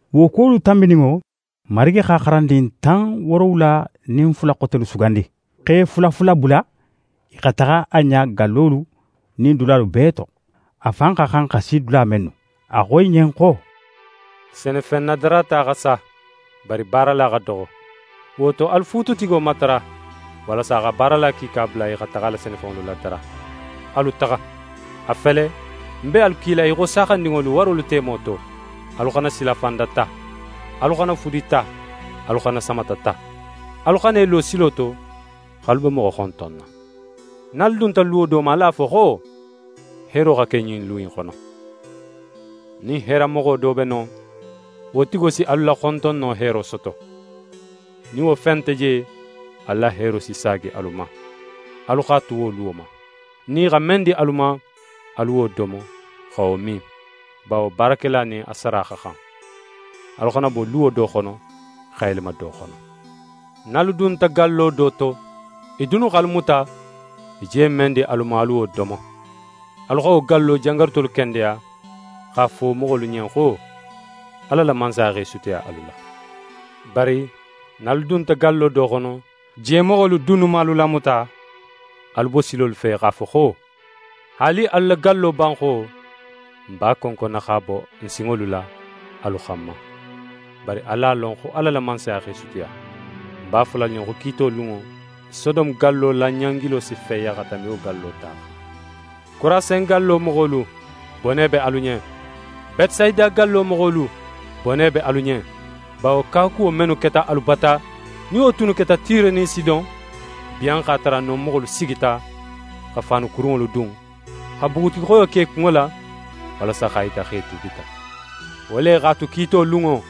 Wo kuwolu tanbininŋo, Marigi xa xarandin tan woorowula nin fula xotelu sugandi, x'e fula fula bula i xa taxa a ɲa gallolu nin dulalu bee to, a fan xa xan xa si dula mennu. A xo i ɲen xo: «Senefen nadarata xa sa, bari baarala xa doxo. Wo to, alu fuututigo matara, walasa a xa baarala kiika bula i xa taxa a la senefenŋolu ladara. Alu taxa! A fele, ń be alu kila í xo saaxandinŋolu, warolu temo to. Alu xana silafanda ta, alu xana fudi ta, alu xana samata ta. Alu xana i lo silo to x'alu be moxo xontonna. Nin alu dunta luwo do ma, alu a fo xo: “Heero xa ke ɲin lu in xono.” Nin heeramoxo do be non, wo tigo si alu la xontonno heero soto; nin wo fen nte je, alu la heero si saagi alu ma. Alu xa tu wo luwo ma. Nin i xa men di alu ma, alu wo domo, xa wo min; bawo baarakela nin a sara xa xan. Alu xana bo luwo do xono xa yelema do xono. Nin alu dunta gallo do to, i dunnu x'alu muta, i je men di alu ma, alu wo domo, alu xa wo gallo jangarutolu kendeya, x'a fo a moxolu ɲen xo: “Ala la Mansaya x'é sutiya alu la.” Bari nin alu dunta gallo do xono, je moxolu dunnu man alu lamuta, alu bo silolu fe x'a fo xo: “Haali alu la gallo banxo, n b'a konkonna x'a bon n sinŋolu la alu xanma. Bari alu a lon xo Ala la Mansaya x'é sutiya.” Ń b'a fola alu ɲen xo kiito lunŋo, Sodome gallo la ɲangilo si feya xa tanbi wo gallo ta xan.» «Korasin gallo moxolu, bone be alu ɲen. Betesayida gallo moxolu, bone be alu ɲen. Bawo kawakuwo mennu keta alu bata, nin wo tunnu keta Tire nin Sidon, biyan x'a tara non moxolu sigita xa faanu kurunŋolu dun, xa bugutixoyo ke i kunŋo la, walasa x'a yita xo i tuubita. Wo le x'a tu, kiito lunŋo,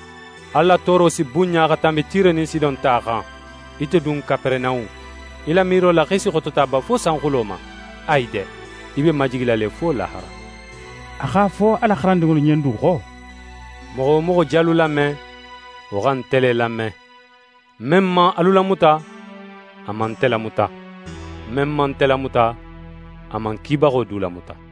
alu la tooro si bunɲa xa tanbi Tire nin Sidon ta xan. Ite dun Kaperenahun, í la miiro la xo í si xotota ba fo sanxulo ma? Ayi de! Í be majigila le fo lahara.» A x'a fo a la xarandinŋolu ɲen du xo: «Moxo wo moxo je alu lame, wo xa nte le lame; men man alu lamuta, a man nte lamuta. Men man nte lamuta, a man ń kibaxo du lamuta.»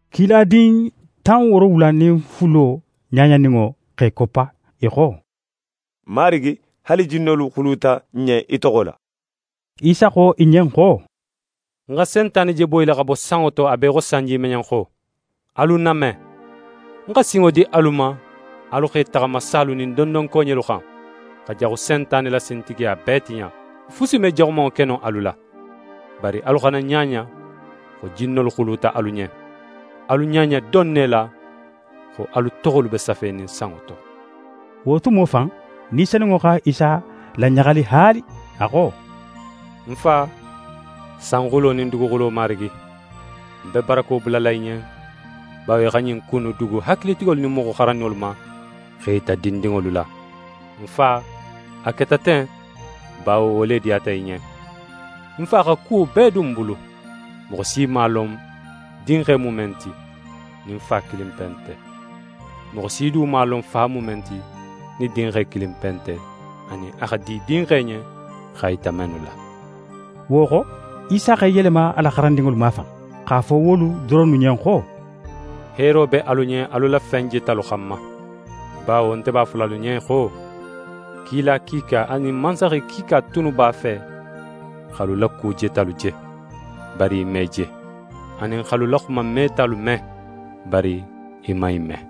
Kiladin tan woorowula nin fulo ɲaɲaninŋo x'e koppa, i xo: «Marigi, haali jinnolu xuluta n ɲen í toxo la.» Isa xo i ɲen xo: «Ń xa Sentane je boyila xa bo sanŋo to a be í xo sanjimeɲenxo. Alu ń name! Ń xa sinŋo di alu ma alu x'e taxama salu nin dondonkoɲelu xan, xa Jaxu Sentane la sintigiya bee tiɲa, fusi me jaxumanŋo ke no alu la. Bari alu xana ɲaɲa xo jinnolu xuluta alu ɲen; alu ɲaɲa don ne la xo alu toxolu be safenin sanŋo to.» Wo tumo fan, Ni Senunŋo xa Isa laɲaxali haali, a xo: «Ń Fa, sanxulo nin duguxulo Marigi, ń be barako bulala í ɲen bawo í xa ɲin ku innu dugu hakilitigolu nin moxo xaranninŋolu ma, x'e yita dindinŋolu la. Ń Fa, a keta ten, bawo wo le diyata í ɲen. «Ń Fa xa kuwo bee dun ń bulu. Moxo si man a lon Dinxe mu men ti, nin Fa kilinpe nte. Moxo si du man a lon Fa mu men ti, nin Dinxe kilinpe nte, anin a xa di Dinxe ɲen x'a yita mennu la.» Wo xo, Isa x'é yelema a la xarandinŋolu mafan, x'a fo wolu doronnu ɲen xo: «Heero be alu ɲen alu la fen jetalu xanma. Bawo nte b'a fola alu ɲen xo,kila kiika, anin mansaxe kiika tunnu b'a fe x'alu la ku jetalu je, bari i man i je, anin x'alu la xuma metalu me, bari i man i me.»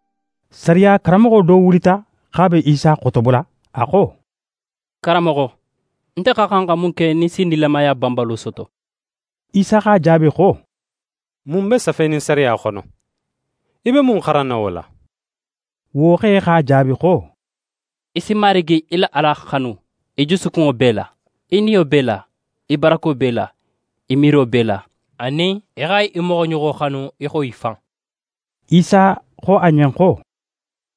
Sariya karanmoxo do wulita x'a be Isa xotobola. A xo: «Karanmoxo, nte xa xan xa mun ke nin ń si nilamaya banbalo soto?» Isa x'a jaabi xo: «Mun be safenin sariya xono? Í be mun xaranna wo la?» Wo xe x'a jaabi xo: «Í si Marigi í la Ala xanu í jusukunŋo bee la, í niyo bee la, í barako bee la, í miiro bee la; anin í xa í moxoɲoxo xanu í xo í fan.» Isa xo a ɲen xo: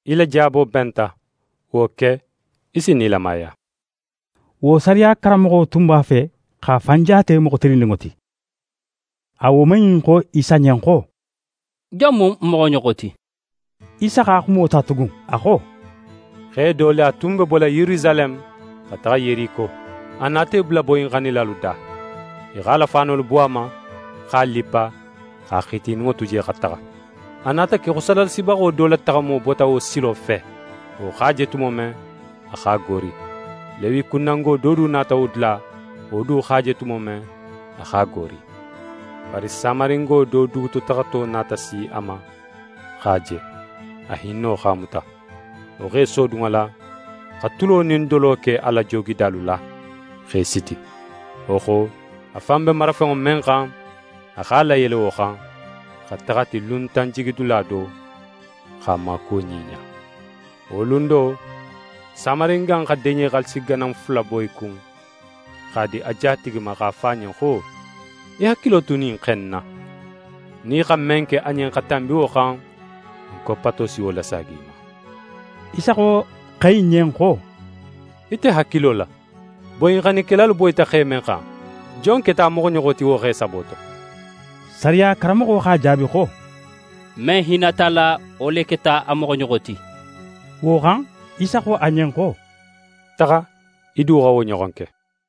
«Í la jaabo benta. Wo ke, í si nilamaya.» Wo sariya karanmoxo tun b'a fe x'a fan jaate moxo tilinninŋo ti, a woman in xo Isa ɲen xo: «Jon mu ń moxoɲoxo ti?» Isa xa xumo ta tugun, a xo: «Xe do le, a tun be bola Yerusaleme xa taxa Yeriko, a nata í bula boyinxannilalu da. I x'a la faanolu bo a ma, x'a lippa, x'a xitininŋo tu je xa taxa. A nata ke xo sadaxalasibaxo do la taxamo bota wo silo fe. Wo x'a je tumo men, a x'a goori. Lewikundango do du nata wo dula, wo du x'a je tumo men, a x'a goori. Bari Samaringo do dugutotaxato nata si a ma x'a je; a hinno x'a muta. Wo x'é sodun a la, xa tulo nin dolo ke a la joogilidalu la, x'e siti. Wo xo, a fan be marafenŋo men xan, a x'a layele wo xan, xa taxa a ti luntanjigidula do, x'a maakuwo ɲiɲa. Wo lun do, Samaringa in xa deɲe xaalisi ganan fula bo í kun, x'a di a jatigi ma x'a fo a ɲen xo: “Í hakilo tu ɲin xe in na. Nin í xa men ke a ɲen xa tanbi wo xan, ń koppato si wo lasaagi í ma”.» Isa xo xe in ɲen xo: «Ite hakilo la, boyinxannikelalu boyita xe men xan, jon keta a moxoɲoxo ti wo xe sabo to?» Sariya karanmoxo x'a jaabi xo: «Men hinnata a la, wo le keta a moxoɲoxo ti.» Wo xan, Isa xo a ɲen xo: «Taxa, í du xa wo ɲoxon ke.»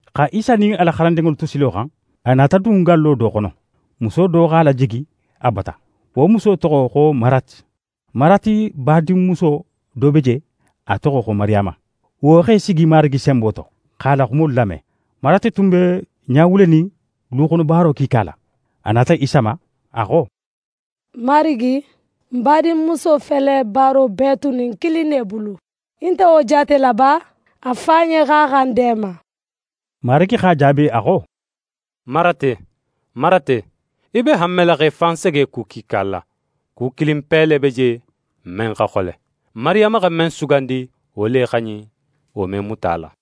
Xa Isa nin a la xarandinŋolu tu silo xan, a nata dun gallo do xono. Muso do x'a lajigi a bata. Wo muso toxo xo Marate. Marate badinmuso do be je, a toxo xo Mariyama, wo x'é sigi Marigi senbo to, x'a la xumolu lame. Marate tun be ɲawulenin luxonobaaro kiika la. A nata Isa ma, a xo: «Marigi, ń badinmuso fele baaro bee tunin ń kilin ne bulu. Í nte wo jaatela ba? A fo a ɲen xo a xa ń deema.» Marigi x'a jaabi, a xo: «Marate, Marate, í be hanmela x'é fan sege ku kiika la. Ku kilinpe le be je, men xa xole. Mariyama xa men sugandi, wo le xa ɲin; wo me muta a la.»